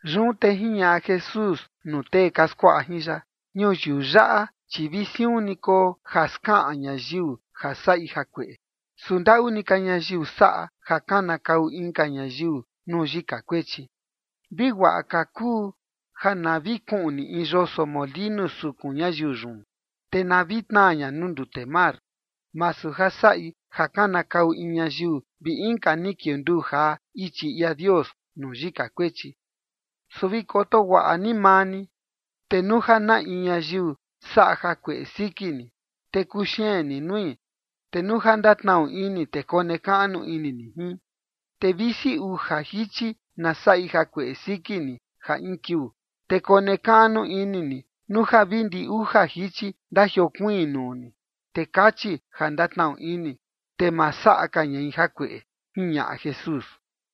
Yun te jiñaꞌa Jesús nuu tee ka skuaꞌa jin ya: ―Ñuyiu yaꞌa chi vi siun ni koo ja skaꞌan ñayiu ja saꞌi jakueꞌe, su ndaꞌu ni ka ñayiu saꞌa ja kanakau inka ñayiu nuu yika kuechi. Vi guaꞌa ka kuu ja na vi kuꞌni in yoso molinu sukun ñayiu yun, te na vi tnaa ña nuu ndute mar, masu ja saꞌi ja kanakau in ñayiu vi inka ni kiunduu jaa ichi ia Dios nuu yika kuechi. Su vi koto guaꞌa ni maa ni, te nuu ja na in ñayiu saꞌa jakueꞌe siki ni, te kuxeen ni nui. Te nuu ja ndatnaꞌu ini, te konekaꞌnu ini ni jin. Te visi uja jichi na saꞌi jakueꞌe siki ni ja in kiuu, te konekaꞌnu ini ni nuu ja vi ndi uja jichi ndajiokuiin nuu ni, te kachi ja ndatnaꞌu ini, te ma saꞌa ka ñai jakueꞌe ―jiñaꞌa Jesús.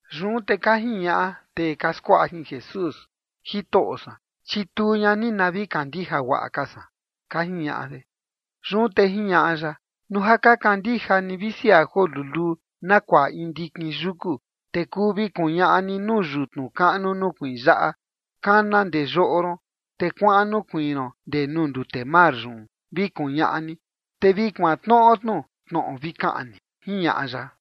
Yun te ka jiñaꞌa tee ka skuaꞌa jin Jesús: ―Jitoꞌo san, chituu ña ni na vi kandija guaꞌa ka san ―ka jiñaꞌa de. Yun te jiñaꞌa ya: ―Nuu ja ka kandija ni visi ja joo luluu na kuaꞌa in ndikin yuku, te kuu vi kuñaꞌa ni nuu yutnu kaꞌnu nukuiin yaꞌa: “Kana ndee yoꞌo ron, te kuaꞌan nukuiin ron ndee nuu ndute mar yun”, vi kuñaꞌa ni, te vi kuantnoꞌo tnu tnoꞌo vi kaꞌan ni ―jiñaꞌa ya.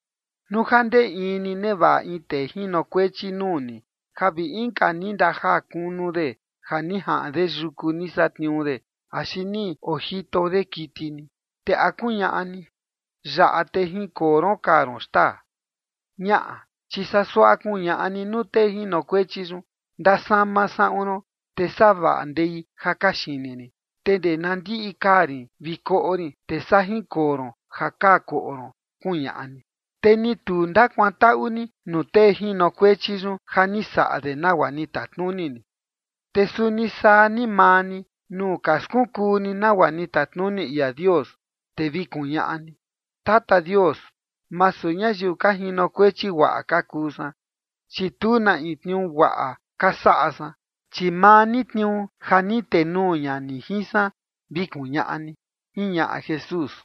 ’Nuu ja ndee in ni nevaꞌa in tee jinokuechi nuu ni ja vi inka ni ndajaa kunu de ja ni jaꞌan de yuku ni satniuu de axi ni ojito de kiti ni, te ¿a kuñaꞌa ni: “Yaꞌa, te jinkoo ron kaa ron xtaa”? Ñaꞌa, chi saa suaꞌa kuñaꞌa ni nuu tee jinokuechi yun: “Ndasama saꞌun ron, te savaꞌa ndei ja kaxini rin, te ndee na ndiꞌi kaa rin vi koꞌo rin, te saa jinkoo ron ja kaa koꞌo ron”, kuñaꞌa ni. Te ni tu ndakuantaꞌu ni nuu tee jinokuechi yun ja ni saꞌa de nagua ni tatnuni ni. Te suni saa ni maa ni, nuu ka skunkuu ni nagua ni tatnuni ia Dios, te vi kuñaꞌa ni: “Tata Dios, masu ñayiu ka jinokuechi guaꞌa ka kuu san, chi tu na in tniuu guaꞌa ka saꞌa san, chi maa ni tniuu ja ni tenuu ña ni jin san”, vi kuñaꞌa ni ―jiñaꞌa Jesús.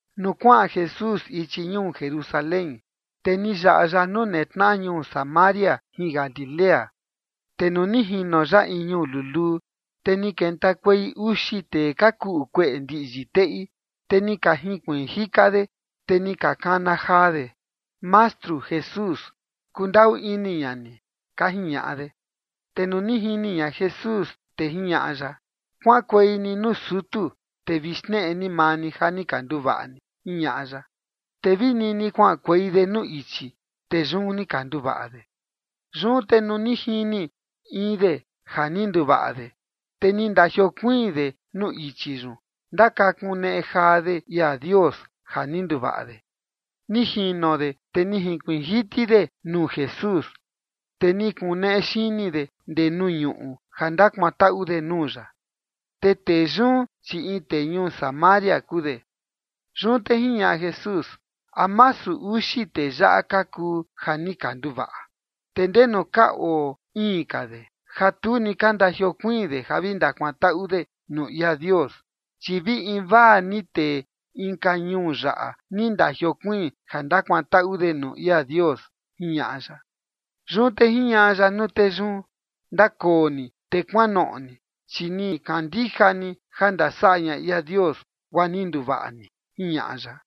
Nuu kuaꞌan Jesús ichi ñuu Jerusalén, te ni yaꞌa ya nuu netnaꞌa ñuu Samaria jin Galilea. Te nuu ni jino ya in ñuu luluu, te ni kentakuei uxi tee ka kuꞌu kueꞌe ndiꞌyi teꞌi, te ni ka jinkuiin jika de, te ni ka kana jaa de: ―Mastru Jesús, kundaꞌu ini ña ni ―ka jiñaꞌa de. Te nuu ni jini ña Jesús, te jiñaꞌa ya: ―Kuaꞌankuei ni nuu sutu, te vi xneꞌe ni maa ni ja ni ka nduvaꞌa ni ―jiñaꞌa ya. Te vi nini kuaꞌankuei de nuu ichi, te yun ni ka nduvaꞌa de. Yun te nuu ni jini in de ja ni nduvaꞌa de, te ni ndajiokuiin de nuu ichi yun ndakakuneꞌe jaa de ia Dios ja ni nduvaꞌa de. Ni jino de, te ni jinkuiin jiti de nuu Jesús, te ni kuneꞌe xini de ndee nuu ñuꞌu ja ndakuantaꞌu de nuu ya. Te tee yun, chi in tee ñuu Samaria kuu de. Yun te jiñaꞌa Jesús: ―¿A masu uxi tee yaꞌa ka kuu ja ni ka nduvaꞌa? ¿Te ndenu ka oo iin ka de ja tu ni ka ndajiokuiin de ja vi ndakuantaꞌu de nuu ia Dios? Chi vi invaa ni tee inka ñuu yaꞌa ni ndajiokuiin ja ndakuantaꞌu de nuu ia Dios ―jiñaꞌa ya. Yun te jiñaꞌa ya nuu tee yun: ―Ndakoo ni te kuanoꞌo ni, chi ni kandija ni ja ndasaꞌa ña ia Dios, guaa ni nduvaꞌa ni ―jiñaꞌa ya.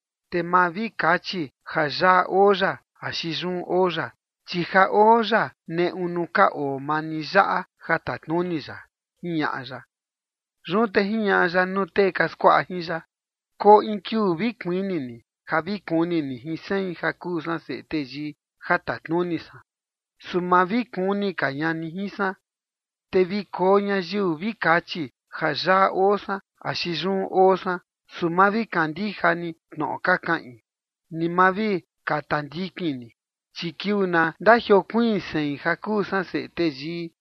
Te ma vi kachi ja yaꞌa oo ya axi yun oo ya, chi ja oo ya neꞌu nuu ka oo maa ni yaꞌa ja tatnuni ya ―jiñaꞌa ya. Yun te jiñaꞌa ya nuu tee ka skuaꞌa jin ya: ―Koo in kiuu vi kuini ni ja vi kuni ni jin sein, ja kuu san Seꞌe Teyii, ja tatnuni san. Su ma vi kuni ka ña ni jin san. Te vi koo ñayiu vi kachi ja yaꞌa oo san axi yun oo san, su ma vi kandija ni tnoꞌo ka kaꞌin, ni ma vi kata ndikin ni. Chi kiuu na ndajiokuiin sein, ja kuu san Seꞌe Teyii,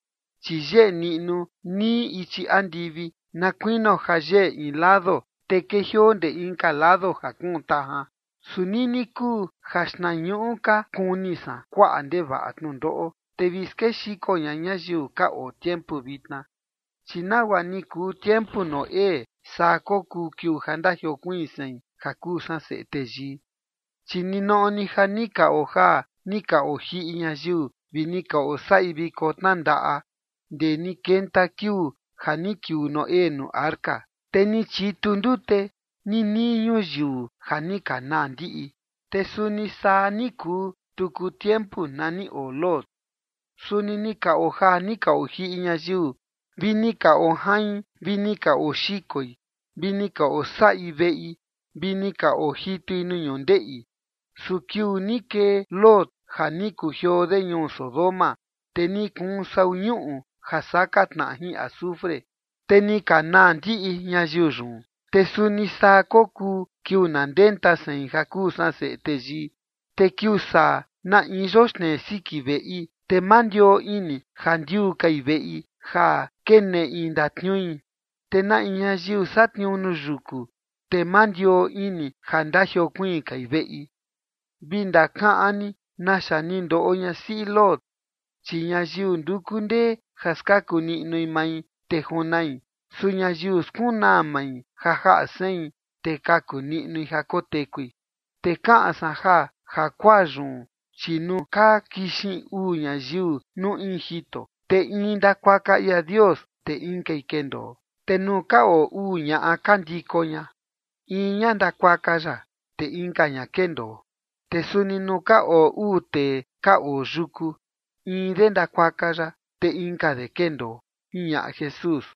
chi yeꞌe niꞌnu nii ichi andivi na kuinio ja yeꞌe in lado, te kejioo ndee inka lado ja kuun tajan. Su nini kuu ja xtnañuꞌu ka kuni san kuaꞌa ndevaꞌa tnundoꞌo, te vi skexiko ña ñayiu ka oo tiempu vitna. Chi nagua ni kuu tiempu Noé, saa kokuu kiuu ja ndajiokuiin sein, ja kuu san Seꞌe Teyii. Chi ninoꞌo ni ja ni ka ojaa ni ka ojiꞌi ñayiu vi ni ka osaꞌi viko tnandaꞌa ndee ni kenta kiuu ja ni kiuu Noé nuu arca, te ni chitu ndute ninii ñuyiu ja ni ka naa ndiꞌi. Te suni saa ni kuu tuku tiempu na ni oo Lot. Suni ni ka ojaa ni ka ojiꞌi ñayiu, vi ni ka ojain vi ni ka oxikoi, vi ni ka osaꞌi veꞌi, vi ni ka ojitui nuu ñundeꞌi. Su kiuu ni kee Lot ja ni kujioo de ñuu Sodoma, te ni kuun sau ñuꞌu ja saka tnaꞌa jin azufre, te ni ka naa ndiꞌi ñayiu yun. Te suni saa kokuu kiuu na ndenta sein, ja kuu san Seꞌe Teyii. ’Te kiuu saa na in yoxnei siki veꞌi, te ma ndioo ini ja ndiuu kai veꞌi ja keneꞌi ndatniui. Te na in ñayiu satniuu nuu yuku, te ma ndioo ini ja ndajiokuiin kai veꞌi. Vi ndakaꞌan ni naxa ni ndoꞌo ñasiꞌi Lot. Chi ñayiu nduku ndee ja skaku niꞌnui mai, te junai. Su ñayiu skunaa mai ja jaꞌa sein, te kaku niꞌnui ja kotekui. ’Te kaꞌan san ja jakuaa yun, chi nuu ka kixin uu ñayiu nuu in jito, te in ndakuaka ia Dios, te inkai kendoo. Te nuu ka oo uu ñaꞌa ka ndiko ña, in ña ndakuaka ya, te inka ña kendoo. Te suni nuu ka oo uu tee ka oo yuku, in de ndakuaka ya, te inka de kendoo ―jiñaꞌa Jesús.